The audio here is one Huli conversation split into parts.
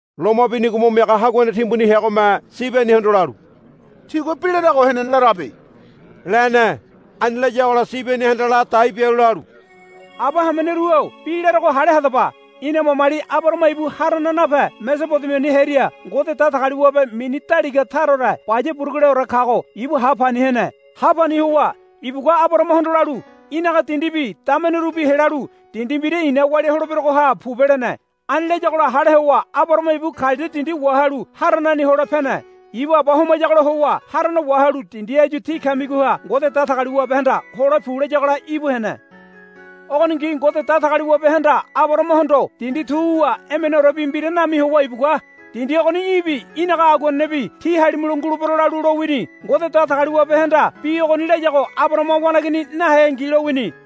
Loma binigo mo miaga haguane timbuni heagome Sibenihondo lalu, Tigua bi larago henene larabe, lene. Ani layagola Sibenihanda ladai bialu lalu, Aba hameneru-o bi larogo hale hadaba. Ina mamali Abarahama ibu Haranaha nape Mesobodemiani hearia Ngode Datagaliwabe mini daliga taraore baya buruguleore kago ibu ha pani hene. Ha pani howa ibugua Abarahamahondo lalu, Í̠naga dindibi damenerubi helalu dindi mbira i̱na walia holeberogoha pobe, lene. Ani layagola hale howa Abarahama ibu Kaladia dindi wahalu Haranani hole pene. Ibu aba homayagola howa Harana wahalu dindi áyu tí kamigoha Ngode Datagaliwabehanda, Hole pu, layagola íbu hene. Ogoningi Ngode Datagaliwabehanda Abarahamahondo dindi tu wuwa emeneorebi mbira nami howa ibugua, Dindi ogoni í̠bi í̠naga aguanenebi tí halimulo ngulebero, lalu lowini. Ngode Datagaliwabehanda bi ogoni layago Abarahama waneigini naheangi lowini.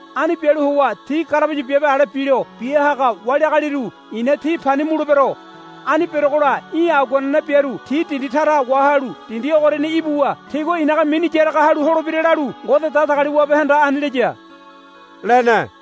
Ani bialu howa ti garabaya biabe ale bilo bia haga wali agaliru i̱na ti pani mulebero. Ani berogola í̠ aguanene biaru ti dindi tara wahalu dindi ogoriani ibuwa tigua i̱naga mini yaraga halu holebira, lalu Ngode Datagaliwabehanda ani laya, lene.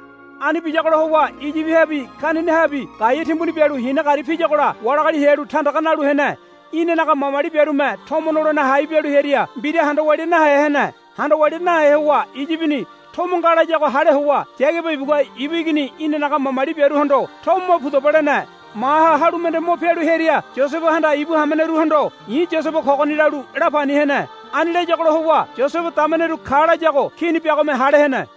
Ani biyagola howa Iyibihabi Kenanahabi gaea timbuni bialu hina gari piyagola wali agali hearu tandaga nalu hene. Inanaga mamali biarume tomo nolene hai bialu hearia mbira handa walia nahe hene. Handa walia nahe howa Iyibini tomo nga layago hale howa Yagaba ibugua ibu igini inanaga mamali biaruhondo, Tomo mo pudaba, lene. Maha halu mende mo pialu hearia Yosebehanda ibu hameneruhondo, I̱ Yosebe kogoni, lalu la pani hene. Ani layagola howa Yosebe dameneru ka layago kini biagome hale hene.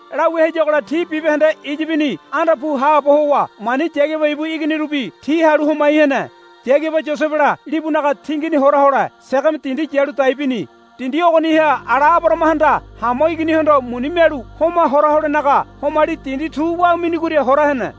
Lawia hayagola ti bibahende Iyibini anda pu haabo howa mani Yagaba ibu iginirubi ti halu homai hene. Yagaba Yosebela libunaga tingini hora hole Segeme dindi yalu dai bini. Dindi ogoniha ala Abarahamahanda Hamo iginihondo muni mialu homa hora holenaga homali dindi tu wa minigoria hora hene.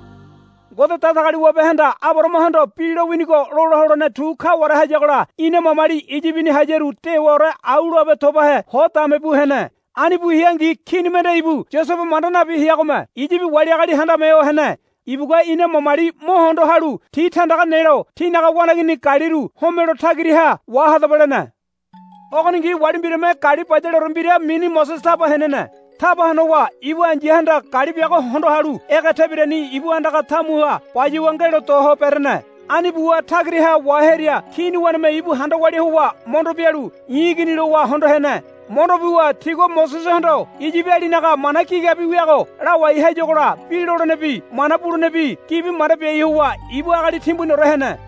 Ngode Datagaliwabehanda Abarahamahondo bi lowinigo lola holene tu kaware hayagola ina mamali Iyibini hayaru dewaore au loabe tobahe ho dame bu hene. Ani bu heangi kini mende ibu Yosebe manda nabi heagome Iyibi wali agali handame ho hene. Ibugua ina mamali mo hondo halu ti tandaga nelo, Tínaga waneigini galiru homelo tagiraha wahadaba, lene. Ogoningi wali mbirame gali bayaleore mbira mini Mosese taba henene. Taba honowa ibu ai̱yahanda gali biago hondo halu ege tebirani ibu andaga tamuha bayuwa ngelo do ho berene. Ani buwa tagiraha wahearia kini waneme ibu handa walia howa mondo bialu, I̱ igini, lowa hondo hene. Mondo buwa tigua Mosesehondo Iyibialinaga mana gigabi wiago lawai hayagola bi lolenebi mana bulenebi gibi manda biai howa ibu agali timbuniore hene.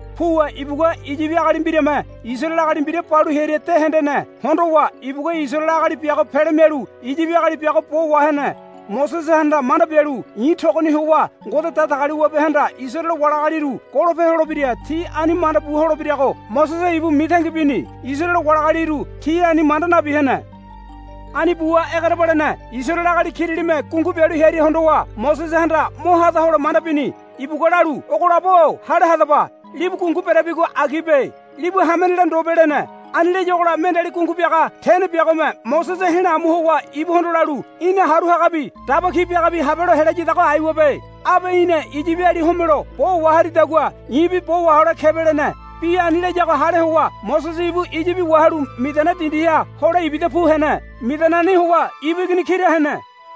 Puwa ibugua Iyibi agali mbirame Isaraele agali mbira balu hearia de hendene. Hondowa ibugua Isaraele agali biago pele mialu Iyibi agali biago bo wahene. Mosesehanda manda bialu, I̱ togoni howa Ngode Datagaliwabehanda Isaraele wali agaliru golope holebira ti ani manda bu holebirago, Mosese ibu mitangi bini. Isaraele wali agaliru ti ani manda nabi hene. Ani buwa egerebalene Isaraele agali kiralime gungu bialu hearia hondowa Mosesehanda mo hada hole manda bini. Ibugua lalu, Ogo labo-o hale hadaba. Libu gungu berabigo agibe. Libu hamenela ndobe, lene. Ani layagola mendeali gungu biaga tene biagome Mosese he̱la amu howa ibuhondo lalu, Í̠na haru hagabi daba ki biagabi habelo helayadago aiwabe. Abe í̠na Iyibi agali homelo bo waharidagua i̱bi bo wahole kebe, lene. Bi ani layago hale howa Mosese ibu Iyibi wahalu Midiana dindiha hole ibida pu hene. Midianani howa ibu igini kira hene.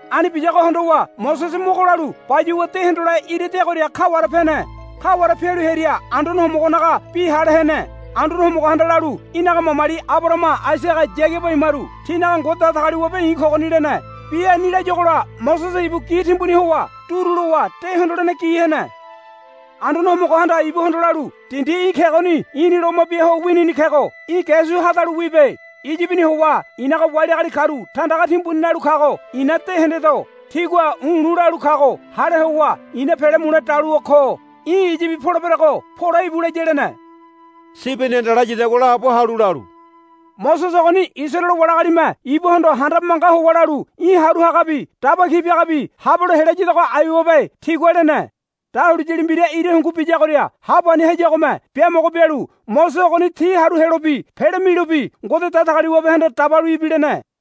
Ani biyago hondowa Mosese mogo lalu bayuwa de hondole ira deagoria kaware pene. Kaware pialu hearia Anduane Homogonaga bi hale hene. Anduane Homogohanda lalu, Í̠naga mamali Abarahama Aisaga Yagaba imaru tinaga Ngode Datagaliwabe i̱ kogoni, lene. Bi ani layuagola Mosese ibu gi timbuni howa duru lowa de hondolene gi hene. Anduane Homogohanda ibuhondo lalu, Dindi í̠ kegoni i̱ni loma bia ho winini kego í̠ ge su hadalu wibe. Iyibini howa i̱naga wali agali karu tandaga timbuni nalu kago i̱na de hendedo. Tigua u̱lu̱ lalu kago hale howa i̱na pele mule daluwa ko. Í̠ Iyibi poleberego pole íbu, laya, lene. Sibenihanda layadagua laabo halu lalu, Mosese ogoni Isaraele wali agalime ibuhondo handabe manga howa lalu, Í̠ haru hagabi daba ki biagabi habelo helayadago aiwabe, tigua lene. Dahuliyali mbira ira hungu biyagoria ha pani hayagome biamogo bialu Mosese ogoni ti haru helobi pele milobi Ngode Datagaliwabehanda dabalu ibilene.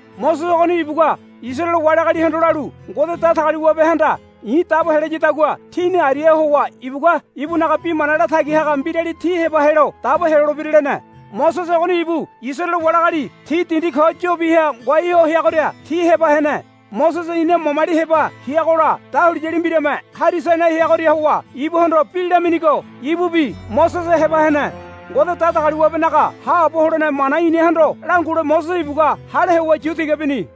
Mosese ogoni ibugua Isaraele wali agalihondo lalu, Ngode Datagaliwabehanda i̱ dabo helayadagua tíni ariaha howa ibugua ibunaga mana latagi haga mbirali tí heba helo dabo helolebira, lene. Mosese ogoni ibu Isaraele wali agali ti dindi ko yobiha ngoai ho heagoria ti heba hene. Mosese ina mamali heba heagola dahuliyali mbiralime Hari Sainai heagoria howa ibuhondo bi laminigo ibubi Mosese heba hene. Ngode Datagaliwabenaga haabo holene mana inahondo langule Mosese ibugua hale howa yu tiga bini.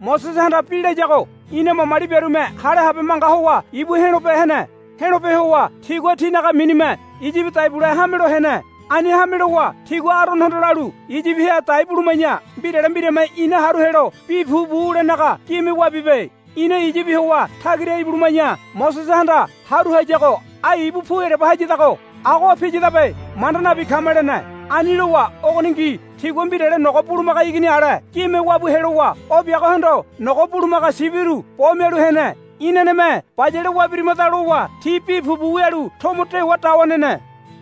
Mosesehanda bi layago ina mamali biarume hale habe manga howa ibu he̱lope hene. He̱lope howa tigua tinaga minime Iyibi dai bule hamelo hene. Ani hame lowa tigua Aronohondo lalu, Iyibiha dai buluma̱ya mbirale mbirame ina haru helo bi pupu wulenaga gime wabibe. Ina Iyibi howa tagira ibuluma̱ya Mosesehanda haru hayago ai ibu pu ereba hayadago. Agoha piyadabe manda nabi kama, lene. Ani lowa ogoningi tigua mbirale nogo bulumaga igini ale gime wabu helowa o biagohondo nogo bulumaga sibiru bo mialu hene. Inaneme bayale wabirimada, lowa ti bi pupu wialu tomo dewa dawa nene.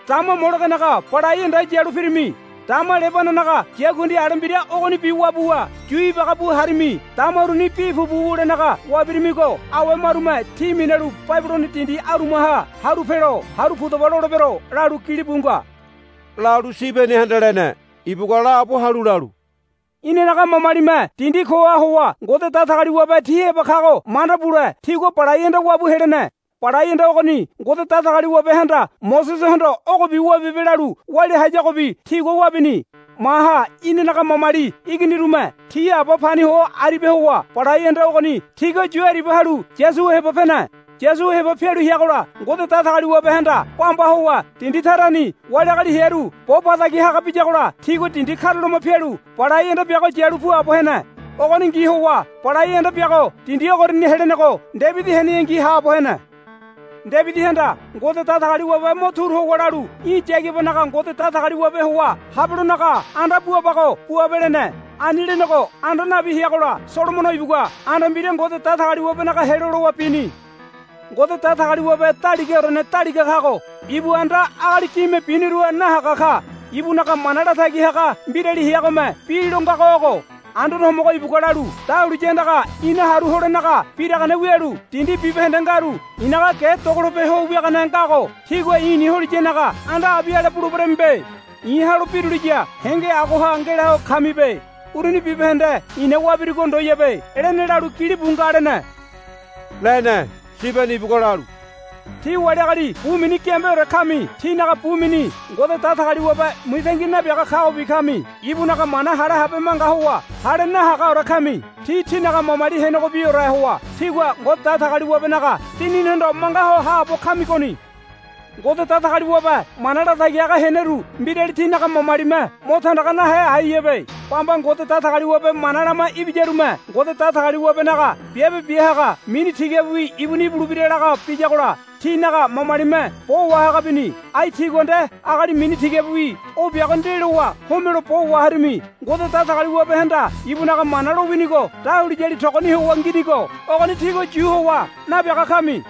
Dama Molegenaga balai anda yalu pirimi. Dama Lebananaga yakundi ale mbira ogonibi wabuwa yu ibaga bu harimi. Dama uruni bi pupu wulenaga wabirimigo awe marume tí minalu Babilono dindi amuraha haru pelo, Haru pudaba, lolebero, lalu gilibu nga, lalu Sibenihanda lene. Ibugua laabo halu lalu, Inanaga mamalime dindi koha howa Ngode Datagaliwabe ti heba kago manda bule tigua Balai Anda wabu helene. Balai Anda ogoni Ngode Datagaliwabehanda Mosesehondo, Ogobi wabibe, lalu walia hayagobi tigua wabini. Maha inanaga mamali iginirume ti aba pani ho aribia howa Balai Anda ogoni tigua yu aribia halu Yosua heba pene. Yosua heba pialu heagola Ngode Datagaliwabehanda bamba howa dindi tarani wali agali hearu bo ba tagi haga biyagola tigua dindi karulama pialu Balai Anda biago yalu puabo hene. Ogoningi howa Balai Anda biago dindi ogoriani helenego Debidi heneyangi haabo hene. Debidihanda Ngode Datagaliwabe mo turu howa lalu, Í̠ Yagabanaga Ngode Datagaliwabe howa habelonaga anda buabago buabe, lene. Ani lenego anda nabi heagola Solomono ibugua anda mbira Ngode Datagaliwabenaga helo lowa bini. Ngode Datagaliwabe Daligaorene Daliga kago ibu anda agali gime biniruha nahaga ka. Ibunaga mana latagi haga mbirali heagome bi lo ngago ogo, Anduane Homogo ibugua lalu, Dahuliya andaga i̱na haru holenenaga biragane wialu dindi bibahende ngaru i̱naga ge dogolope ho wiagane ngago tígua i̱ni holiyanaga anda abi ale buleberemibe. I̱ ha̱lo̱ biruliya henge agoha ngelaho kamibe. Uruni bibahende i̱na wabirugo ndoyabe, lene lalu gilibu nga, lene. Sibeni ibugua lalu, Tí wali agali bu mini giambeore kami. Tínaga bu mini Ngode Datagaliwabe mitangi nabiaga kagobi kami. Ibunaga mana hale habe manga howa hale nahagaore kami. Tí tínaga mamali henegobiore howa tígua Ngode Datagaliwabenaga Dininihondo manga ho haabo kamigoni. Ngode Datagaliwabe mana latagi haga heneru mbirali tínaga mamalime mo tandaga nahe aiyabe. Bamba Ngode Datagaliwabe mana lama ibiyarume, Ngode Datagaliwabenaga Biabe Bia Haga mini tigabiwi ibuni ibulebira, laga biyagola tínaga mamalime bo wahaga bini. Ai tígua nde agali mini tigabiwi o biago ndelowa homelo bo waharimi. Ngode Datagaliwabehanda ibunaga mana lowinigo dahuliyali togoni howa nginigo ogoni tígua yu howa nabiaga kami,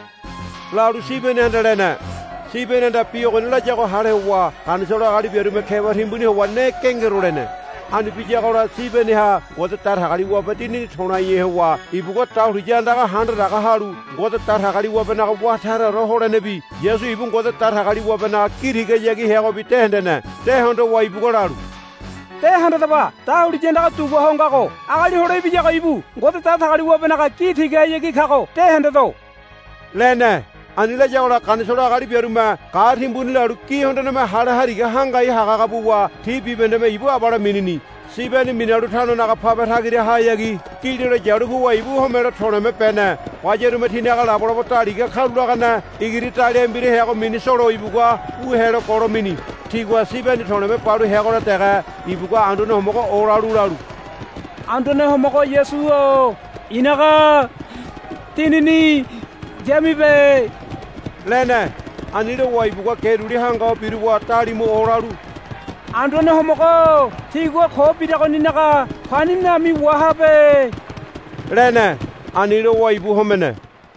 lalu Sibenihanda lene. Sibenihanda bi ogoni layago hale howa Ganisolo agali biarume keba timbuni howa ne gengero lene. Ani biyagola Sibeniha Ngode Datagaliwabe Dinini to̱laihe howa ibugua dahuliya andaga handadaga halu Ngode Datagaliwabenaga wá taraore holenebi Yasu ibu Ngode Datagaliwabenaga gi tigahayagi heagobi de hendene. De hondowa ibugua lalu, De handadaba. Dahuliya andaga dugua ho ngago. Agali Hole Ibiyago ibu Ngode Datagaliwabenaga gi tigahayagi kago de hendedo, lene. Ani layagola Ganisolo agali biarume ga̱ timbuni lalu gi hondoneme hale hariga hangai hagahaga buwa ti bibahendeme ibu abale minini. Sibeni minalu tanonaga pabe tagirahayagi gililo yalu puwa ibu homelo to̱le̱me bene. Bayarume tinaga labolabo daliga karulagane igiri daliahe mbira heago mini Solo ibugua wu helo golo mini. Tigua Sibeni to̱le̱me balu heagola dege ibugua Anduane Homogo olalu lalu, Anduane Homogo Yasu-o i̱naga dinini yamibe, lene. Ani lowa ibugua ge duli hanga ho biruwa dalimu olalu, Anduane Homogo-o tigua ko biragoninaga pani nami wahabe, lene. Ani lowa ibu homene.